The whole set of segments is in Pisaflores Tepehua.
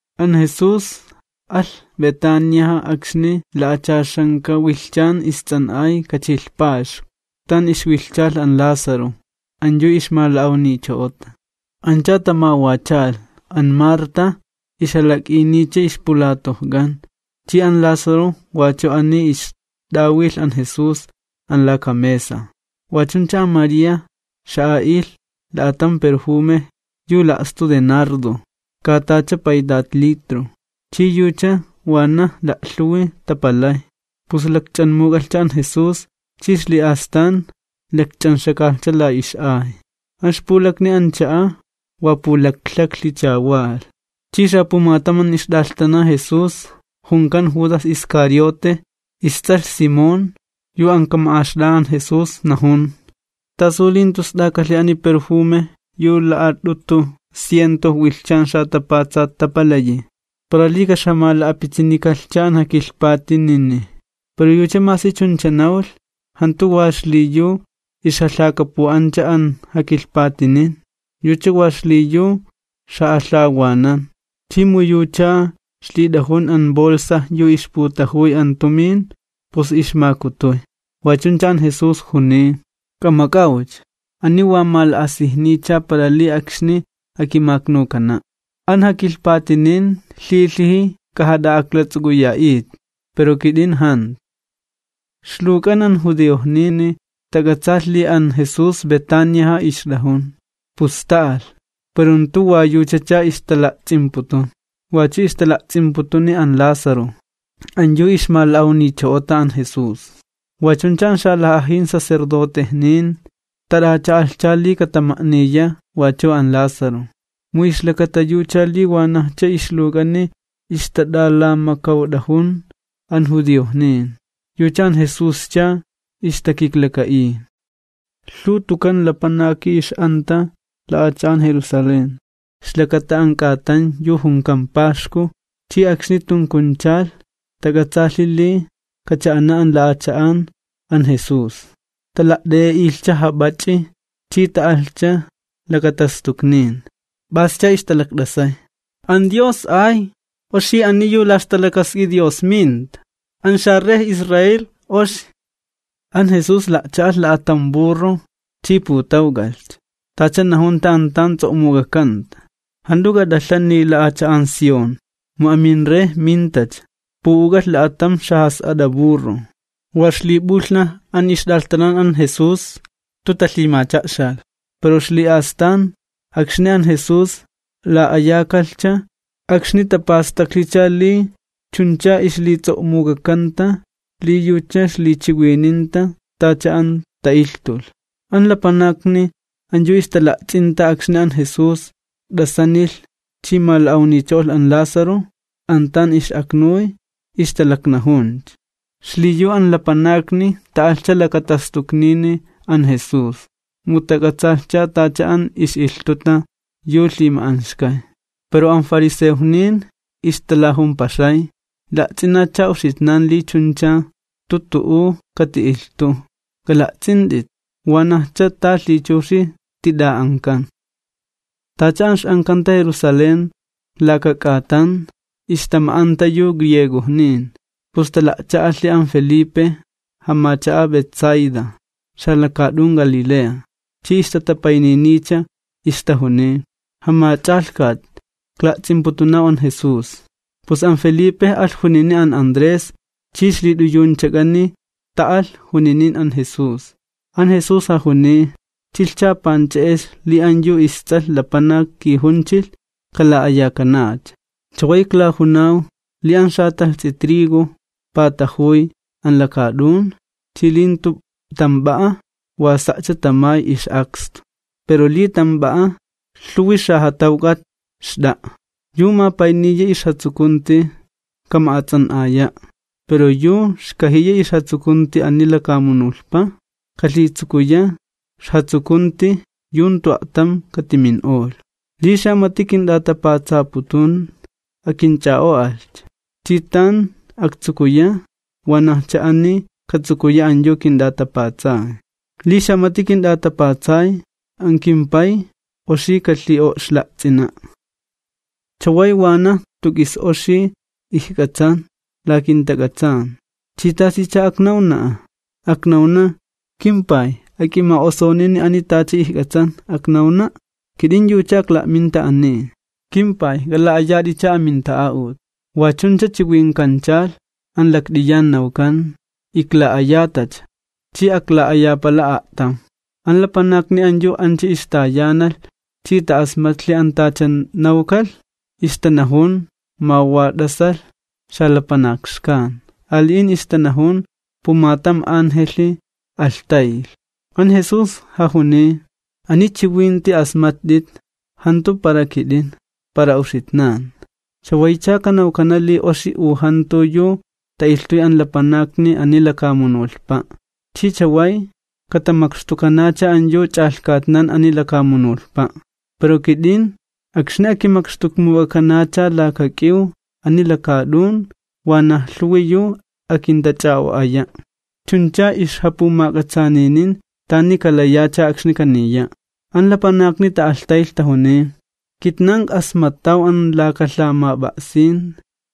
An Jesús alh Betaniaja akxni la'achaxanka wilhchan ists'an'ay kachilh paxku, tan ixwilhchalh an Lázaro, an yu ixmala'awnicho'ota. Ancha tamawachalh, an Marta ixjalak'iniycha ixpulatojk'an, chi an Lázaro wachu ani ixt'awilh an Jesús an laka mesa. Wa chuncha an María xa'a'ilh la'atam perjume yu la'stu de nardo katacha paytat litro, chi yucha wanaj la'lhuwi tapalay, pus lakch'anmuk'alhcha an Jesús, chi ixli'astan lakch'anxakalhcha la ix'ay. An ixpulakni an cha'a wa pulaklhaklhicha walh. Chi xapumatam an ixt'alhtana Jesús, junkan Judas Iscariote, ists'alh Simón, yu an kama'axt'a'a an Jesús, najun: ―¿Tasu li jantu st'akalhi ani perjume yu la'at'utu ciento wilhchan xatapatsat tapalayi, para li ka'ixjamala'pitsinikalhcha an jakilhpatinini? Pero yucha masi chuncha nawlh, jantu wa xliyu ixjalhakapu'ancha an jakilhpatinin, yucha wa xliyu ixja'alhawanan, chi mu yucha ixlit'ajun an bolsa yu ixputajuy an tumin, pus ixmakutuy. Wa chuncha an Jesús juniy: ―K'amak'awcha, ani wa mala'asijniycha para li akxni akimaknukana'. An jakilhpatinin lhilhiji k'ajat'a'aklats'uk'uya'it, pero kit'in jantu. Ixluwk'an an judiojnini tak'atsaalh li an Jesús Betaniaja ixt'ajun, pus ta'alh, pero jantu wa yuchacha ixtala'ts'imputun, wachu ixtala'ts'imputuni an Lázaro, an yu ixmala'awnicho'ota an Jesús. Wa chuncha an xalaj'ajin sacerdotejnin tat'acha'alhcha li katama'niya wachu an Lázaro, mu ixlakata yucha li wanajcha ixluwk'ani ixtat'alamakawt'ajun an judiojnin, yucha an Jesuscha ixtakiklaka'iy. Lhuw tukan lapanaki ix'anta la'acha'an Jerusalén ixlakata an k'atan yu junkan paxku, chi akxni tunkunchalh tak'atsaalhi li kacha'ana an la'acha'an an Jesús, tala't'e'e'ilhcha jap'ach'i chi ta'alhcha lakatastuknin, p'ascha ixtalakt'asay: ―¡Hosanna! ¡Oxi ani yu la ixta'a'ut Dios minta! ¡An xaRey Israel, oxi! An Jesús la'cha'alh la'atam burro chi putawk'alhcha, tacha najunta an tan ts'o'muk'akanta: Jant'u k'at'alhani, la'acha'an Sión. Mu aminRey mintacha, pu'uk'alh la'atam xajas'at'a burro. Wa ixlip'ulhnaj an ixt'alhtanan an Jesús jantu talhimacha'xalh, pero ixli'astan, akxni an Jesús la'ayakalhcha, akxni tapastaklhicha li chuncha ixlits'o'muk'akanta li yucha ixlichiwininta tacha an ta'ilhtulh. An lapanakni an yu ixtala'ts'inta akxni an Jesús t'asanilh chi mala'awnicho'olh an Lázaro an tan ix'aknuy, ixtalaknajuncha. Xliyu an lapanakni ta'alhcha lakatastuknini an Jesús, mu tak'atsaalhcha tacha an ix'ilhtuta yu lhima'anxkay. Pero an fariseojnin ixtalajumpaxay: ―La'ts'inatcha uxitnan li chuncha jantu tu'u kati'ilhtuw. K'ala'ts'int'it, ¡wanajcha ta lhichuxi tit'a'ankan! Tacha an ix'ankanta Jerusalén laka k'atan, ixtama'anta yu griegojnin. Pus tala'cha'alhi an Felipe, jamacha'a Betsaida, xalakaat'un Galilea, chi ixtatapayniniycha, ixtajuniy: ―Jamach'alhkat, ikla'ts'imputunaw an Jesús. Pus an Felipe alh junini an Andrés, chi ixlit'uyunchak'ani ta'alh juninin an Jesús. An Jesús jajuniy: ―Chilhcha panch'e'ex li an yu isTs'alh Lapanak kijunchilh kala'ayakanacha. Chaway iklajunaw li an xatalhts'i trigo patajuy an lakaat'un chi li jantu tamp'a'a, wa sa'cha tamay ix'akstu pero li tamp'a'a, lhuwi xajatawk'at xt'a'a. Yu mapayniya ixjatsukunti, kama'ats'an'aya'. Pero yu xkajiya ixjatsukunti ani lakamunulhpa, kalhitsukuya ixjatsukunti yu jantu a'tam katimin'olh. Li xamati kint'atapatsaputun, akinch'a'o'alhcha. Chi tan aktsukuya, wanajcha ani katsukuya an yu kint'atapatsay. Li xamati kint'atapatsay, an kimPay oxi kalhi'o'xla'ts'ina'. ’Chaway wanaj jantu k'is oxi ijk'atsan la kintak'atsan. ¿Chi tasicha aknawna'a? ¿Aknawna: “KimPay ak'ima'osunini ani tacha ijk'atsan, aknawna'”? ¡Kit'in yuchacha ikla'minta ani! “KimPay, k'ala'ayat'icha aminta'a'ut.” Wa chuncha chiwinkanchalh an lakt'iyan, nawkan: ―Ikla'ayatacha, chi akla'ayapala a'tam. An lapanakni an yu ancha ixtayanalh chi ta'asmatlhi an tacha nawkalh, ixtanajun ma wa t'asalh xalapanak xkan. Ali'in ixtanajun: ―Pumatam angelhi alhtaylh. An Jesús jajuniy: ―Ani chiwinti asmatt'it jantu para kit'in, para uxitnan. Chawaycha kanawkana li oxi u jantu yu ta'ilhtuy an lapanakni ani lakamunulhpa', chi chaway katamakxtukanacha an yu ch'alhkatnan ani lakamunulhpa'. Pero kit'in, akxni akimakxtukmuk'akanacha laka k'iw ani lakaat'un, wanaj lhuwi yu akintach'a'o'aya'. Chunchacha ixjapumak'atsaaninin tani kalayacha akxni kaniya'. An lapanakni ta'alhtaylh tajuniy: ―Kitnan ik'asmattaw an laka lhamap'a'sin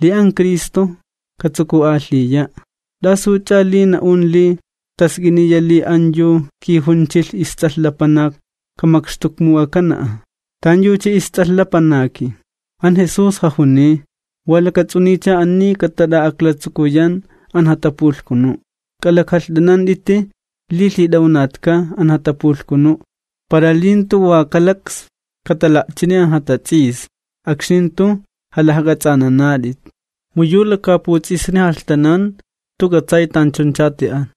li an Cristo katsuku'alhiya'. ¿T'asuch'a li na'un li task'iniya li an yu kijunchilh isTs'alh Lapanak kamakxtukmuk'akana'a? ¿Tanyucha isTs'alh Lapanaki? An Jesús jajuniy: ―Wa lakats'uniycha ani katat'a'aklatsukuyan an jatapulhkunu'. K'alak'alht'anant'iti li lhit'awnatka an jatapulhkunu', para li jantu wa kalaks katala'chini an jatats'isni akxni jant'u jalajk'ats'anant'at'it, mu yu lakaaputs'isni jalhtanan jantu k'atsay tanchuncha ti'an.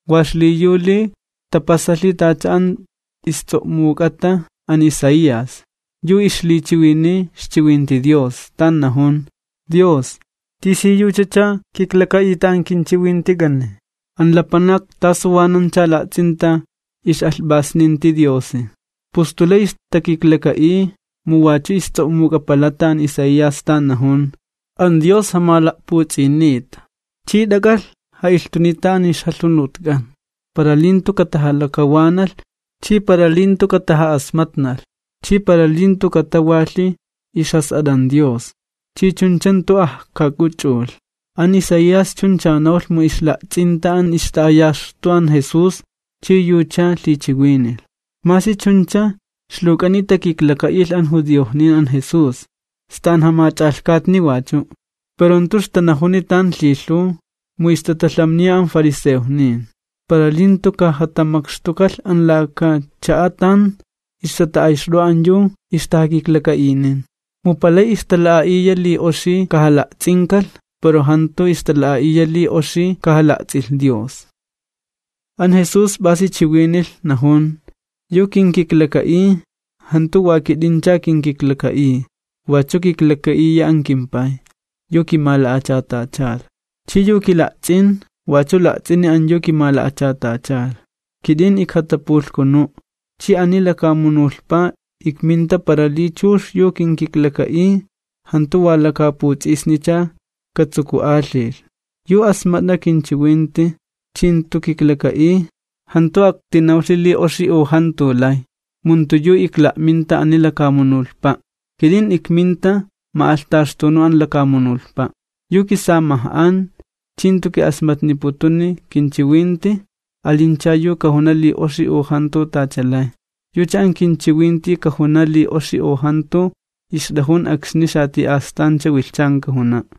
wa xliyu li tapasalhi tacha an ists'o'muk'ata an Isaías, yu ixlichiwiniy ixchiwinti Dios, tan najun: Dios, ¿tisiyuchacha kiklaka'ita an kinchiwintik'ani? ¿An lapanak tasuwanancha la'ts'inta ix'alhp'asninti Diosi? Pus jantu lay ixtakiklaka'iy, mu wachu ists'o'muk'apalata an Isaías tan najun: An Dios jamala'puts'inita chi t'ak'alh ja'ilhtunita an ixjalhunutk'an, para li jantu katajalakawanalh, chi para li jantu kataja'asmatnalh, chi para li jantu katawalhi ixjas'at'an Dios chi chuncha jantu ajkak'uch'ulh. An Isaías chuncha nawlh mu ixla'ts'inta an ixta'ayaxtu an Jesús chi yucha lhichiwinilh. Masi chuncha, ixluwk'ani takiklaka'ilh an judiojnin an Jesús, sta an jamach'alhkatni wachu'. Pero jantu ixtanajuni tan lhilhuw mu ixtatalhamniya an fariseojnin, para li jantu kajatamakxtukalh an laka cha'a tan ixtata'ayxt'o'a an yu ixtajakiklaka'inin. Mu palay ixtala'a'iya li oxi kajala'ts'inkalh, pero jantu ixtala'a'iya li oxi kajala'ts'ilh Dios. An Jesús p'asi chiwinilh, najun: ―Yu kinkiklaka'iy, jantu wa kit'incha kinkiklaka'iy, wachu kiklaka'iya an kimPay, yu kimala'achatachalh. Chi yu kila'ts'in, wachu la'ts'ini an yu kimala'achatachalh. Kit'in ijkatapulhkunu', chi ani lakamunulhpa ikminta para li chux yu kinkiklaka'iy jantu wa lakaaputs'isnicha katsuku'alhilh. Yu asmat'a kinchiwinti chi jantu kiklaka'iy, jantu aktinawlhi li oxi u jantu lay, mu jantu yu ikla'minta ani lakamunulhpa', kit'in ikminta ma'alhtaxtunu an lakamunulhpa'. Yu kisamaj'an chi jantu ki'asmatniputuni kinchiwinti, alincha yu kajuna li oxi u jantu tacha lay, yucha an kinchiwinti kajuna li oxi u jantu ixt'ajun akxni xati'astancha wilhchan kajuna'.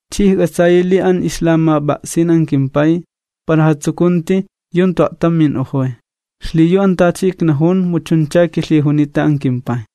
Chi ijk'atsayi li an ixlamap'a'sin an kimPay xt'a'a jatsukunti yu jantu a'tam min'ojoy. Xliyu an tacha iknajun, mu chuncha kilhijunita an kimPay.